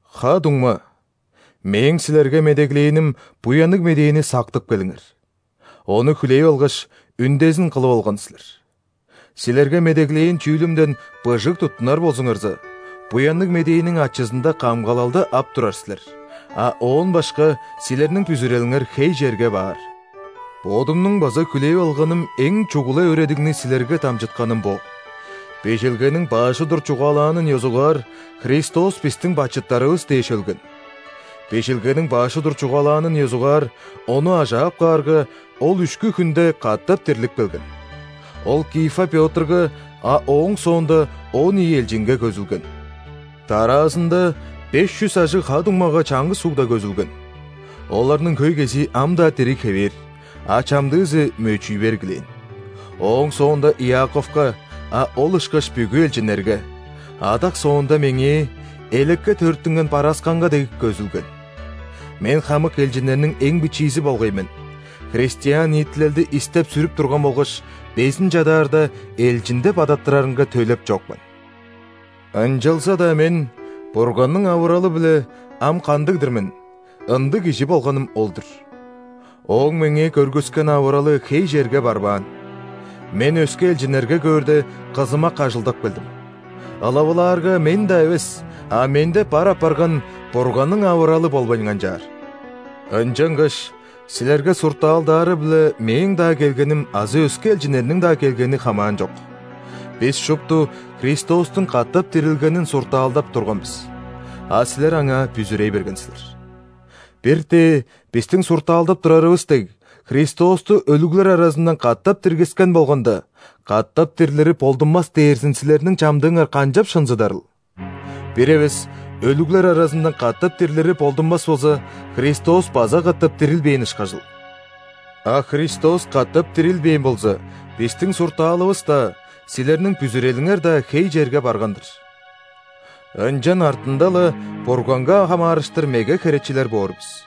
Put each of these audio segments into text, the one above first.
Ха-дуңма, мээң силерге медеглээним Буянныг Медээни сактып келиңер. Ону хүлээп алгаш, үндезин кылып алган силер. Силерге медеглээн чүүлүмден быжыг туттунар болзуңарза, Буянныг Медээниң ачызында камгалалды ап турар силер, а оон башка силерниң бүзүрелиңер хей черге баар. Бодумнуң база хүлээп алганым эң чугула өөредигни силерге дамчытканым бо: Бижилгениң баш удур чугаалаанын ёзугаар, Христос бистиң бачыттарывыс дээш өлген. Бижилгениң баш удур чугаалаанын ёзугаар, Ону ажаап каарга, Ол үшкү хүнде катап дирлип келген. Ол Кифа Пётрга, а ооң соонда он ийи элчинге көзүлген; дараазында беш чүс ажыг ха-дуңмага чаңгыс угда көзүлген (оларның хөй кезии ам-даа дириг хевээр, а чамдыызы мөчүй бергилээн); ооң соонда Иаковка, а ол ышкаш бүгү элчиннерге; адак соонда меңээ – элекке төрүттүнген барасканга дег – көзүлген. Мен хамык элчиннерниң эң бичиизи болгай мен, христиан ниитилелди истеп-сүрүп турган болгаш, безин чадаарда элчин деп адаттырарынга төлеп чок мен. Ынчалза-даа мен Бурганның авыралы-биле, ам кандыг-дыр мен, ындыг кижи болганым ол-дур. Ооң меңээ көргүскен авыралы хей черге барбаан: мен өске элчиннерге көөрде, кызымак ажылдап келдим, ылавылаарга, мен-даа эвес, а менде бар апарган Бурганның авыралы болбайн канчаар. Ынчангаш силерге суртаалдаары-биле мээң-даа келгеним азы өске элчиннерниң-даа келгени хамаанчок. Бис шупту Христостуң катап дирилгенин суртаалдап турган бис, а силер аңаа бүзүрей берген силер. Бир-тээ бистиң суртаалдап турарывыс дег, Христосту өлүглер аразындан катап диргискен болганда, катап дирлири болдунмас дээрзин силерниң чамдыыңар канчап шынзыдарыл? Бир эвес өлүглер аразындан катап дирлири болдунмас болза, Христос база катап дирилбээн ышкажыл. А Христос катап дирилбээн болза, бистиң суртаалывыс-даа, силерниң бүзүрелиңер-даа хей черге барган-дыр. Ынчан артында-ла Бурганга хамаарыштыр меге херечилер боор бис.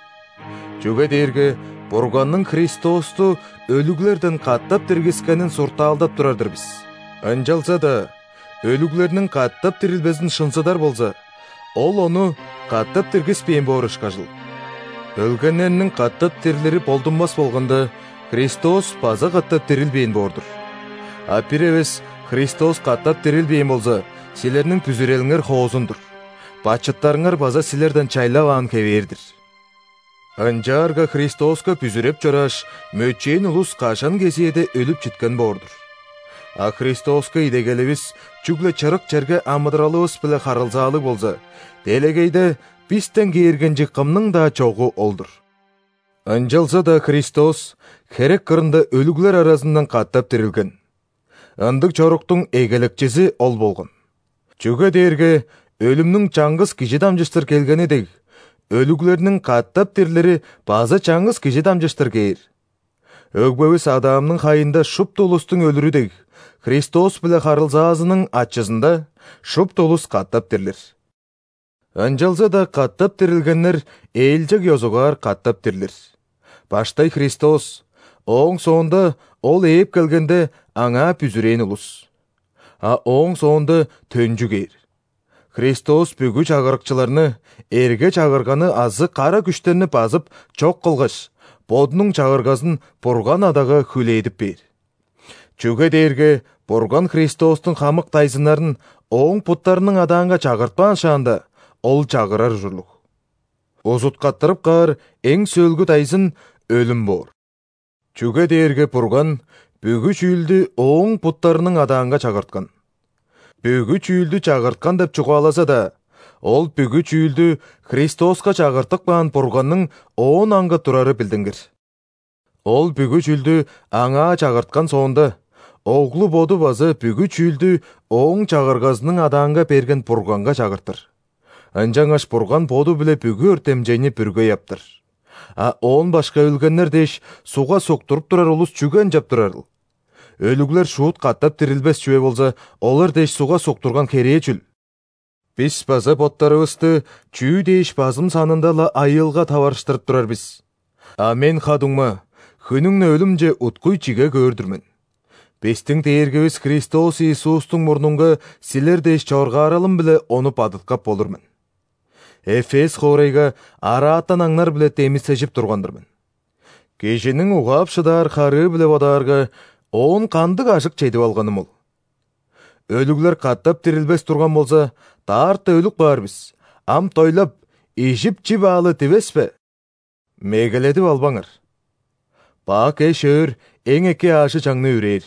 Чүге дээрге Бурганның Христосту өлүглерден катап диргискенин суртаалдап турар-дыр бис, ынчалза-даа өлүглерниң катап дирилбезин шынзыдар болза, Ол Ону катап диргиспээн боор ышкажыл. Өлгеннерниң катап дирлири болдунмас болганда, Христос база катап дирилбээн боор-дур. А бир эвес Христос катап дирилбээн болза, силерниң бүзүрелиңер хоозун-дур, бачыттарыңар база силерден чайлаваан хевээр-дир. Ынчаарга Христоска бүзүреп чорааш, мөчээн улус кажан кезээде өлүп читкен боор-дур. А Христоска идегеливис чүгле чырык черге амыдыралывыс-биле харылзаалыг болза, делегейде бистен кээргенчиг кымның-даа чогу ол-дур. Ынчалза-даа Христос херек кырында өлүглер аразындан катап дирилген. Ындыг чоруктуң Эгелекчизи ол болган! Чүге дээрге өлүмнүң чаңгыс кижи дамчыштыр келгени дег, өлүглерниң катап дирлири база чаңгыс Кижи дамчыштыр кээр. Өгбевис Адамның хайында шупту улустуң өлүрү дег, Христос-биле харылзаазының ачызында шупту улус катап дирлир. Ынчалза-даа катап дирилгеннер ээлчег ёзугаар катап дирлир: баштай – Христос, ооң соонда – Ол ээп келгенде – Аңаа бүзүрээн улус. А ооң соонда төнчү кээр, Христос бүгү чагырыкчыларны, эрге-чагырганы азы кара күштерни базып, чок кылгаш, Бодунуң Чагыргазын Бурган Адага хүлээдип бээр. Чүге дээрге Бурган Христостуң хамык дайзыннарын Ооң буттарының адаанга чагыртпаан шаанда, Ол чагырар ужурлуг. Узуткаттырып каар эң сөөлгү дайзын – өлүм боор. Чүге дээрге Бурган бүгү чүүлдү Ооң буттарының адаанга чагырткан. «Бүгү чүүлдү» чагырткан деп чугаалаза-даа, ол «бүгү чүүлдү» Христоска чагыртып каан Бурганның оон аңгы турары билдингир. Ол бүгү чүүлдү Аңаа чагырткан соонда, Оглу Боду база бүгү чүүлдү Ооң чагыргазының адаанга берген Бурганга чагыртыр. Ынчангаш Бурган Боду-биле бүгү өртемчейни бүргей аптар. А оон башка өлгеннер дээш, ·сугга суктуруп турар улус чүге ынчап турарыл? Өлүглер шуут катап дирилбес чүве болза, олар дээш сугга суктурган херээ чүл? Бис база боттарывысты чүү дээш базым санында-ла айыылга таварыштырып турар бис? А мен, ха-дуңма, хүннүң-не өлүмче уткуй чиге көөр-дүр мен, бистиң Дээргивис Христос Иисустуң мурнунга силер дээш чоргааралым-биле ону бадыткап болур мен. Эфес хоорайга «араатан аңнар-биле» демисежип турган-дыр мен. Кижиниң угаап шыдаар харыы-биле бодаарга, оон кандыг ажык чедип алганым ол? Өлүглер катап дирилбес турган болза: «Даарта өлүп каар бис – ам дойлап, ижип-чип аалы!» – дивес бе? Мегеледип албаңар! «Бак эш-өөр эң эки аажы-чаңны үрээр».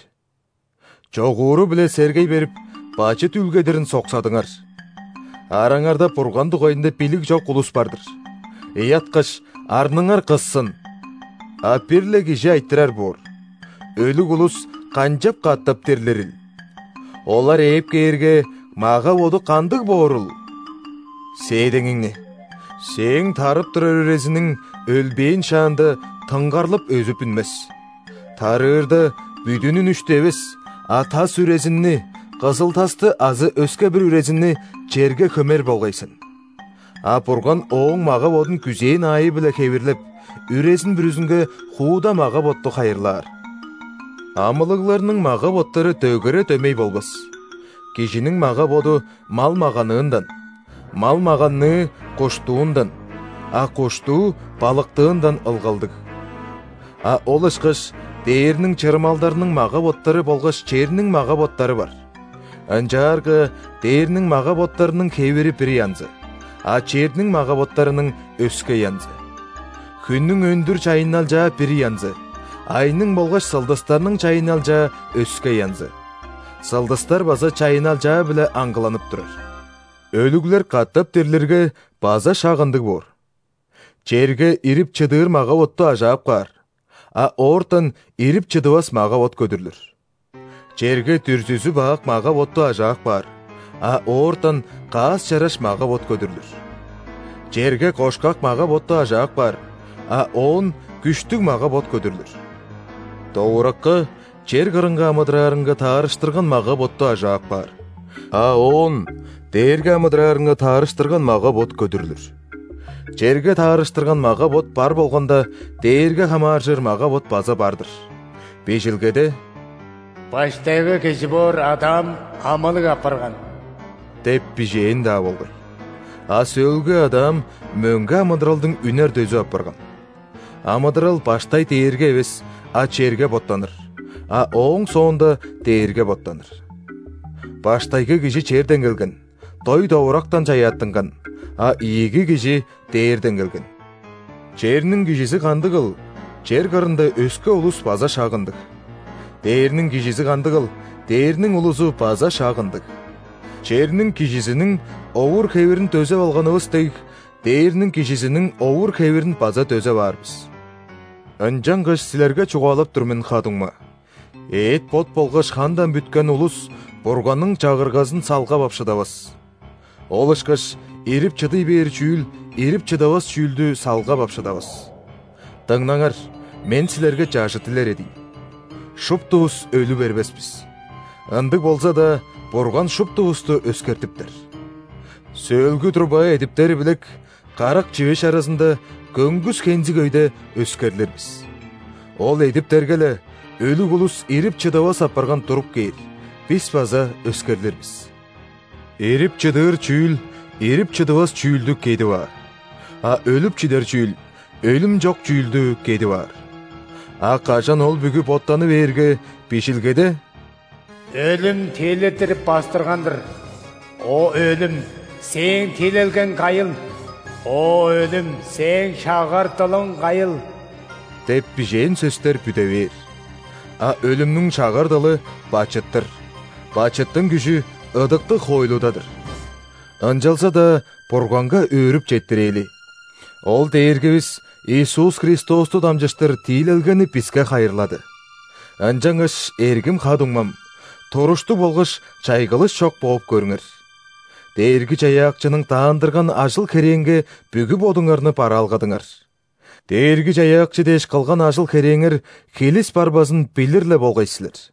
Чогууру-биле сергей берип, бачыт үүлгедирин соксадыңар! Араңарда Бурган дугайында билиг чок улус бар-дыр. Ыяткаш, арныңар кыссын! А бир-ле кижи айтырар боор: «Өлүг улус канчап катап дирлирил? Олар ээп кээрге, мага-боду кандыг боорул?» Сээдеңиңни! Сээң тарып турар үрезиниң, өлбээн шаанда, тынгарлып, өзүп үнмес. Тарыырда, бүдүн үнүштү эвес, а тас үрезинни – кызыл-тасты азы өске-бир үрезинни – черге хөмер болгай сен. А Бурган ооң мага-бодун күзээн аайы-биле хевирлеп, үрезин бүрүзүнге хууда мага-ботту хайырлаар. Амылыгларның мага-боттары дөгере дөмей болбас: кижиниң мага-боду мал-маганыындан, мал-маганныы – куштуундан, а куштуу – балыктыындан ылгалдыг. А ол ышкаш дээрниң чырымалдарының мага-боттары болгаш черниң мага-боттары бар. Ынчаарга дээрниң мага-боттарының хевири бир янзы, а черниң мага-боттарының – өске янзы. Хүннүң өндүр чайынналчаа бир янзы, айның болгаш сылдыстарның чайынналчаа өске янзы. Сылдыстар база чайынналчаа-биле аңгыланып турар. Өлүглер катап дирлирге, база шак ындыг боор: черге ирип-чыдыыр мага-ботту ажаап каар, а оортан ирип-чыдывас мага-бот көдүрлүр. Черге дүрзүзү бак мага-ботту ажаап каар, а оортан каас-чараш мага-бот көдүрлүр. Черге кошкак мага-ботту ажаап каар, а оон күштүг мага-бот көдүрлүр. Довуракка чер кырынга амыдыраарынга таарыштырган мага-ботту ажаап каар, а оон дээрге амыдыраарынга таарыштырган мага-бот көдүрлүр. Черге таарыштырган мага-бот бар болганда, дээрге хамааржыр мага-бот база бар-дыр. Бижилгеде: «Баштайгы кижи боор Адам амылыг апарган» деп бижээн-даа болгай. А сөөлгү Адам мөңге амыдыралдың үнер дөзү апарган. Амыдырал баштай дээрге эвес, а черге боттаныр, а ооң соонда – дээрге боттаныр. Баштайгы кижи черден келген, дой-довурактан чаяаттынган, а ийиги КижиR дээрден келген. Черниң кижизи кандыгыл, чер кырында өске улус база шак ындыг. Дээрниң Кижизи кандыгыл, дээрниң улузу база шак ындыг. Черниң кижизиниң овур-хевирин дөзеп алганывыс дег, дээрниң Кижизиниң овур-хевирин база дөзеп аар бис. Ынчангаш силерге чугаалап тур мен, ха-дуңма: эът-бот болгаш хандан бүткен улус Бурганның Чагыргазын салгап ап шыдавас. Ол ышкаш ирип-чыдый бээр чүүл ирип-чыдывас чүүлдү салгап ап шыдавас. Дыңнаңар, мен силерге чажыт илередийн: шуптувус өлү бербес бис, ындыг болза-даа, Бурган шуптувусту өскертиптер. Сөөлгү труба эдиптери билек, карак чивеш аразында, көңгүс хензиг өйде өскерлир бис. Ол эдиптерге-ле, өлүг улус ирип-чыдывас апарган туруп кээр, бис база өскерлир бис. Ирип-чыдыыр чүүл ирип-чыдывас чүүлдү «кедип аар», а өлүп-чидер чүүл өлүм чок чүүлдү «кедип аар». А кажан ол бүгү боттаны бээрге, Бижилгеде:«Өлүм тиилеттирип бастырган-дыр!» «О өлүм, сээң тиилелгең кайыл?О өлүм, сээң шагар дылың кайыл?» деп бижээн сөстер бүде бээр. А өлүмнүң шагар дылы – бачыт-тыр, бачыттың күжү – ыдыктыг хоойлуда-дыр. Ынчалза-даа Бурганга өөрүп четтирээли, Ол Дээргивис Иисус Христосту дамчыштыр тиилелгени биске хайырлады! Ынчангаш, эргим ха-дуңмам, туруштуг болгаш чайгылыш чок бооп көрүңер. Дээрги-Чаяакчының даандырган ажыл-херээнге бүгү бодуңарны бараалгадыңар. Дээрги-Чаяакчы дээш кылган ажыл-херээңер хилис барбазын билир-ле болгай силер.